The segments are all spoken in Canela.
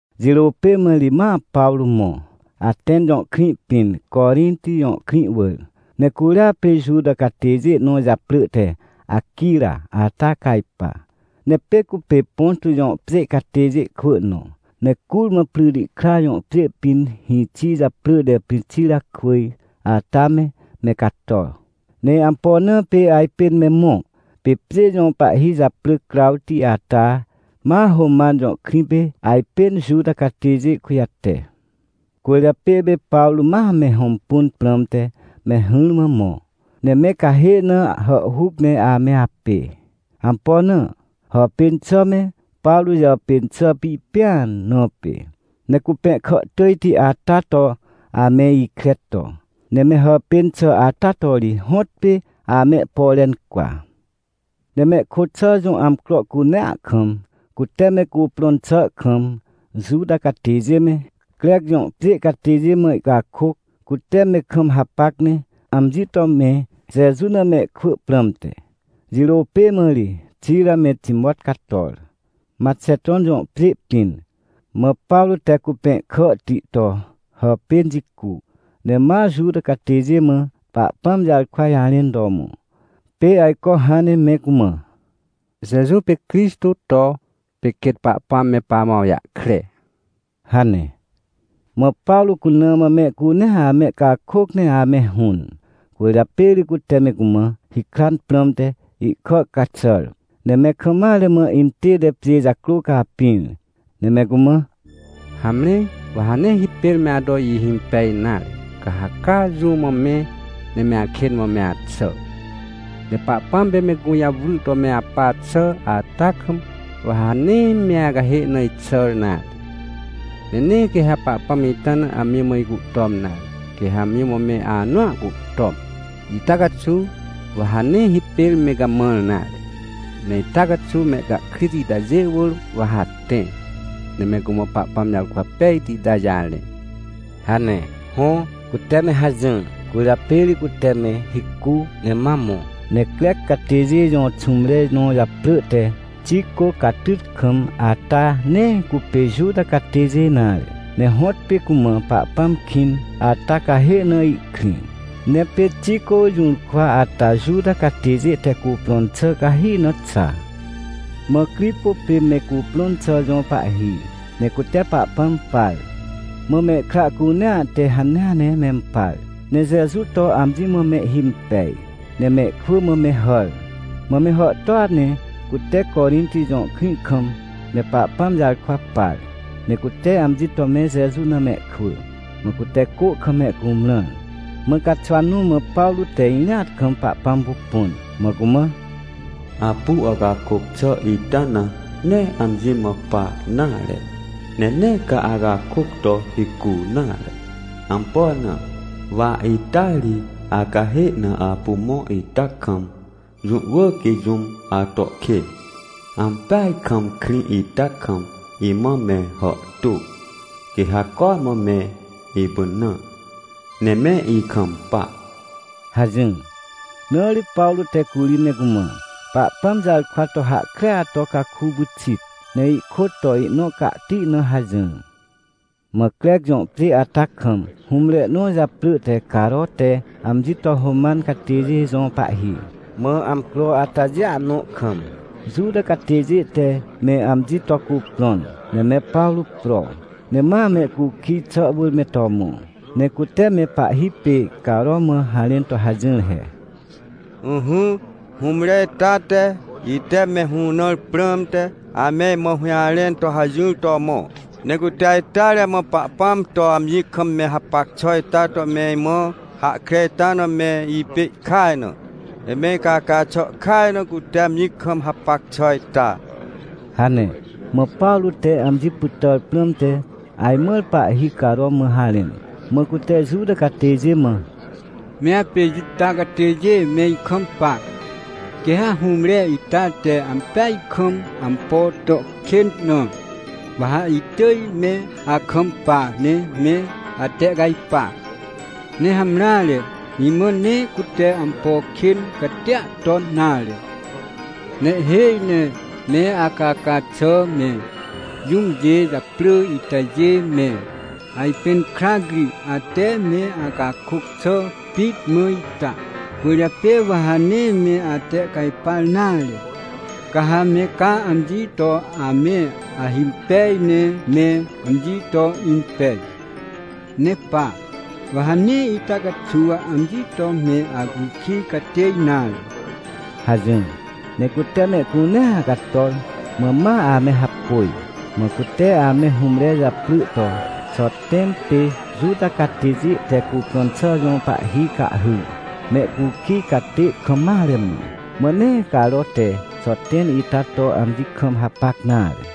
Jirô pê mã ri, ma Pawrô mõ, Atẽn jõ krĩ pĩn, Corinti jõ krĩ wỳr. Ne curia pê Juta catêjê nõ japrỳ te Aquira ata cajpa. Ne pê cupê Ponto jõ pjê catêjê kwỳ nõ. Ne curmã Prytikra jõ pjê pĩn hĩxi japrỳ te Prixirakwỳj ata me, me cato. Ne ampo na pê ajpên me mõ? Pê pjê jõ pahhi japrỳ Crawti ata ma Roman jõ krĩ pê, ajpên Juta catêjê kujate. Cwỳrjapê pê Pawrô ma me hõmpun prãmte me hỹrmã mõ, ne me cahê na hàhhuc ne ame apê. Ampo na? Hàpên xà me Pawrô jàpên xà pipẽan na pê, ne cupẽhkà tỳjti ata to ame ikre to. Ne me hàpên xà ata to ri hõtpê amehpore incwa. Ne mehkôt xà jõ amcro cunea kam, cute me cuprõn xà kam, Juta catêjê me, Crec jõ pjê catêjê mã ihcakôc, cute me kam hapac ne amji to me Jeju na mehkwỳ prãmte. Jirô pê mã ri Xira me Timot cator, Maxeton jõ pjê pĩn, mã Pawrô te cupẽhkàhti to hàpên jicu, ne ma Juta catêjê mã Pahpãm jarkwa jarẽn to mõ, pê ajco hãn ne me cumã: — Jeju pê Crixtô to, pê quêt Pahpãm me pamã awjahkre — hane. Mã Pawrô cuna mã mehcunea amehcakôc ne ame hũn. Cwỳrjapê ri cute me cumã hikran prãmte ihkà caxàr, ne me kam mare mã intête pjê jacrô capĩr. Ne me cumã: — Hamre, wa ha nee hipêr me ato ihimpej nare, ca ha caa jũ mã me, ne me akên mã me axà. Ne Pahpãm pê me gũjawry to me apa xà ata kam, wa ha nee me acahê na ixàr nare. Ne nee quê ha Pahpãm ita na amji mã icuhtom nare, quê ha amji mã me anõa cuhtom. Ita caxuw wa ha nee hipêr me gamãr nare. Ne ita caxuw mehcahkrit itajê wỳr wa ha tẽ, ne me cumã Pahpãm jarkwa pejti itajê jarẽ — hane. Hõ, cute me hajỹr. Cwỳrjapê ri cute me hicu, ne ma mõ, ne Crec catêjê jõ xũmre nõ japrỳ te Tico Catytkam ata nee cupê Juta catêjê nare, ne hõtpê cumã Pahpãm kĩn ata cahê na ihkrĩ. Ne pê Tico jũrkwa ata Juta catêjê te cuprõn xà cahi na xa. Mã Cripo pê me cuprõn xà jõ pahhi, ne cute Pahpãm par, mã mehkra cunea te hanea ne mempar, ne Jeju to amji mã mehhimpej, ne mehkwỳ mã me hàr. Mã me hàhtôa ne cute Corinti jõ krĩ kam me Pahpãm jarkwa par, ne cute amji to me Jeju na mehkwỳ, mã cute cô kam mehcumrãr. Mã caxwa nõ mã Pawrô te irĩat kam Pahpãm pupun, mã cumã: — Apu acakôc xà ita na, nee amji mã pa nare, ne nee ca acakôc to hicu nare. Ampo na? Wa ita ri acahê na apu mõ ita kam, jũ wỳr quê jũm ato kên. Ampeaj kam krĩ ita kam imã me hàhtô, quê ha cormã me ipynã ne me ikampa — hajỹr. Na ri Pawrô te curi me cumã Pahpãm jarkwa to hahkrea to caku pyxit, ne ihkôt to ihnõ cahti na hajỹr. Mã Crec jõ pjê ata kam, hũmre nõ japrỳ te Caro te amji to Roman catêjê jõ pahhi. Mã amcro atajêa nõ kam, Juta catêjê te me amji to cuprõn, ne me Pawrô pro, ne ma mehcukij xà wỳr me to mõ. Ne cute me pahhi pê Caro mã harẽn to hajỹr he: — Ỹhỹ, hũmre ita te, ite me hũnãr prãmte, ame imã hũjarẽn to hajỹr to mõ. Ne cute ajteare mã Pahpãm to amji kam me hapac xà ita to me imã hahkre ita na me ipê ihkaj na. Ne me icaca xà kaj na cute amji kam hapac xà ita — hane. Mã Pawrô te amji pytàr prãmte ajmãr pahhi Caro mã harẽn, mã cute Juta catêjê mã: — Me apê Juta catêjê me ikampa. Quê ha hũmre ita te ampeaj kam ampo to kên na, wa ha itỳj me akampa ne me atehcajpa. Ne hamreare, imã nee cute ampo kên catia ton nare. Ne ihhêj ne me acaca xà me, jũmjê japrỳ itajê me, ajpẽn krac ri ate me acakôc xà pit mã ita. Cwỳrjapê wa ha nee me atehcajpar nare, ca ha me caa amji to ame ahimpej ne me amji to impej. Ne pa, wa ha nee ita caxuw amji to me acukij catê nare — hajỹr. Ne cute mehcunea cator, mã ma ame hapôj. Mã cute ame hũmre japrỳ to Xoten pê Juta catêjê te cuprõn xà jõ pahhi cahhyr, mehcukij catê kam mare mã. Mã nee Caro te Xoten ita to amji kam hapac nare.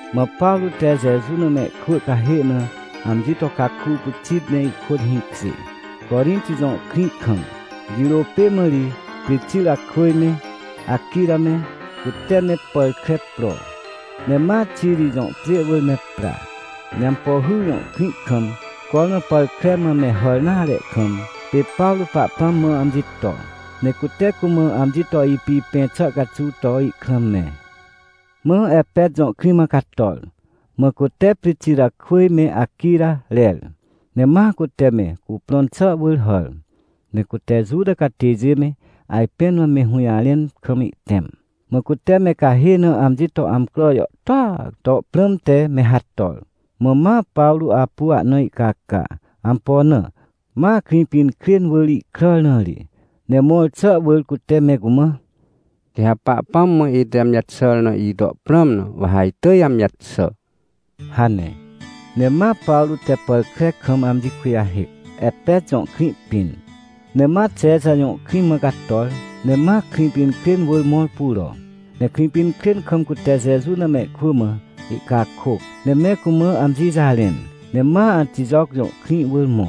Mã Pawrô te Jeju na mehkwỳ cahê na amji to caku pyxit ne ihkôt hĩkjê, Corinti jõ krĩ kam. Jirô pê mã ri, Prixirakwỳj me, Aquira me, cute me pàr kre pro, ne ma Xiri jõ pjê wỳr me pra. Ne Ampohy jõ krĩ kam, cormã pàr kre mã me hàr nare kam, pê Pawrô Pahpãm mã amji to, ne cute cumã amji to ipipẽ xà caxuw to ihkrã mẽ. Mã Epet jõ krĩ mã cator, mã cute Prixirakwỳj me Aquira rer. Ne ma cute me cuprõn xà wỳr hàr, ne cute Juta catêjê me ajpẽn mã me hũjarẽn kam ihtẽm. Mã cute me cahê na amji to amcro jàhtôa to prãmte me hator. Mã ma Pawrô apu ahna ihcaca, ampo na, ma Krĩpinkrên wỳr ihkràr na ri. Ne mõr xà wỳr cute me cumã: — Quê ha Pahpãm mã ite amji jaxàr na ito prãm na, wa ha itỳj amji jaxà — hane. Ne ma Pawrô te pàr kre kam amji kujahêc, Epet jõ krĩ pĩn. Ne ma Xexa jõ krĩ mã cator, ne ma Krĩpinkrên wỳr mõr puro. Ne Krĩpinkrên kam cute Jeju na mehkwỳ mã ihcakôc, ne me cumã amji jarẽn, ne ma Antijoc jõ krĩ wỳr mõ.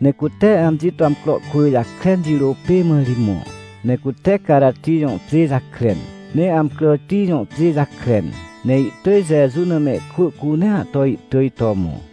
Ne cute amji to amcro kwỳ jakren, jirô pê mã ri mõ, ne cute Carati jõ pjê jakren, ne Amcràti jõ pjê jakren, ne ihtỳj Jeju na mehkwỳ cunea to ihtỳj to mõ.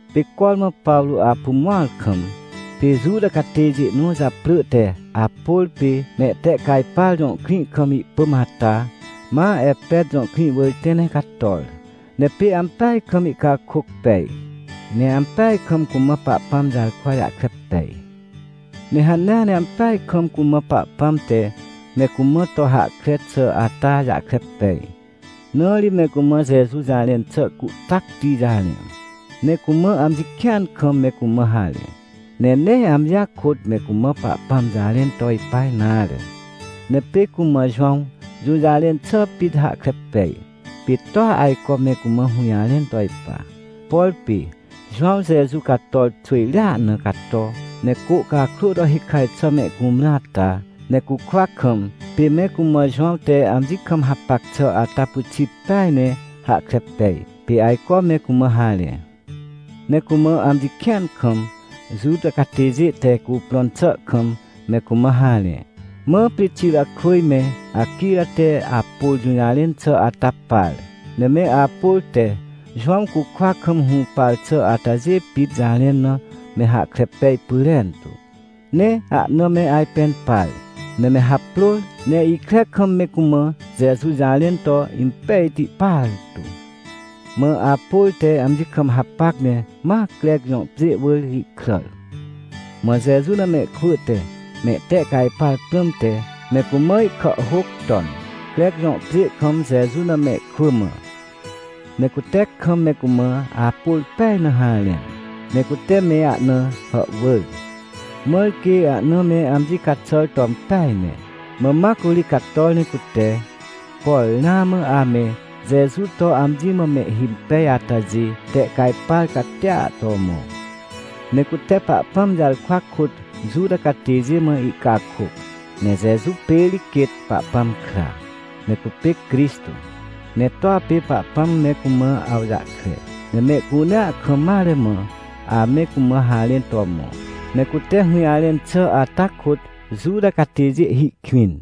Pê cormã Pawrô apu mõar kam, pê Juta catêjê nõ japrỳ te Apôr pê Mehtehcajpar jõ krĩ kam ihpỳm ata, ma Epet jõ krĩ wỳr tẽ ne cator. Ne pê ampeaj kam ihcakôc pej, ne ampeaj kam cumã Pahpãm jarkwa jahkre pej. Ne hanea ne ampeaj kam cumã Pahpãm te me cumã to hahkre xà ata jahkre pej, na ri me cumã Jeju jarẽn xà cuhtacti jarẽ. Ne cumã amji kĩan kam me cumã harẽ. Ne nee amjia kôt me cumã Pahpãm jarẽn to ipa nare, ne pê cumã Jowãw jũjarẽn xà pit hahkre pej, pê toa ajco me cumã hũjarẽn to ipa. Por pê Jowãw Jeju cator xwỳjrea na cato, ne cô cakrô to hikaj xà mehcumrã ata, ne cukwa kam, pê me cumã Jowãw te amji kam hapac xà ata pyxit peaj ne hahkre pej, pê ajco me cumã harẽ. Ne cumã amji kĩan kam, Juta catêjê te cuprõn xà kam me cumã harẽ. Mã Prixirakwỳj me Aquira te Apôr jũjarẽn xà ata par, ne me Apôr te Jowãw cukwa kam hũpar xà atajê pit jarẽn na me hahkre pej pyrentu. Ne ahna me ajpẽn par, ne me haprôr ne ikre kam me cumã Jeju jarẽn to impejti partu. Mã Apôr te amji kam hapac ne ma Crec jõ pjê wỳr ihkràr. Mã Jeju na mehkwỳ te mehtehcajpar prãmte, me cumã ihkàhhôc ton, Crec jõ pjê kam Jeju na mehkwỳ mã. Ne cute kam me cumã Apôr pej na harẽn, ne cute me ahna hàhwỳr, mãr quê ahna me amji caxàr to impeaj ne. Mã ma curi cator ne cute, por ramã ame Jeju to amji mã mehhimpej atajê, tehcajpar catia to mõ. Ne cute Pahpãm jarkwa kôt Juta catêjê mã ihcakôc, ne Jeju pê ri quêt Pahpãm kra, ne cupê Crixtô, ne toa pê Pahpãm me cumã awjahkre, ne mehcunea kam mare mã ame cumã harẽn to mõ. Ne cute hũjarẽn xà ata kôt Juta catêjê hi kwĩn.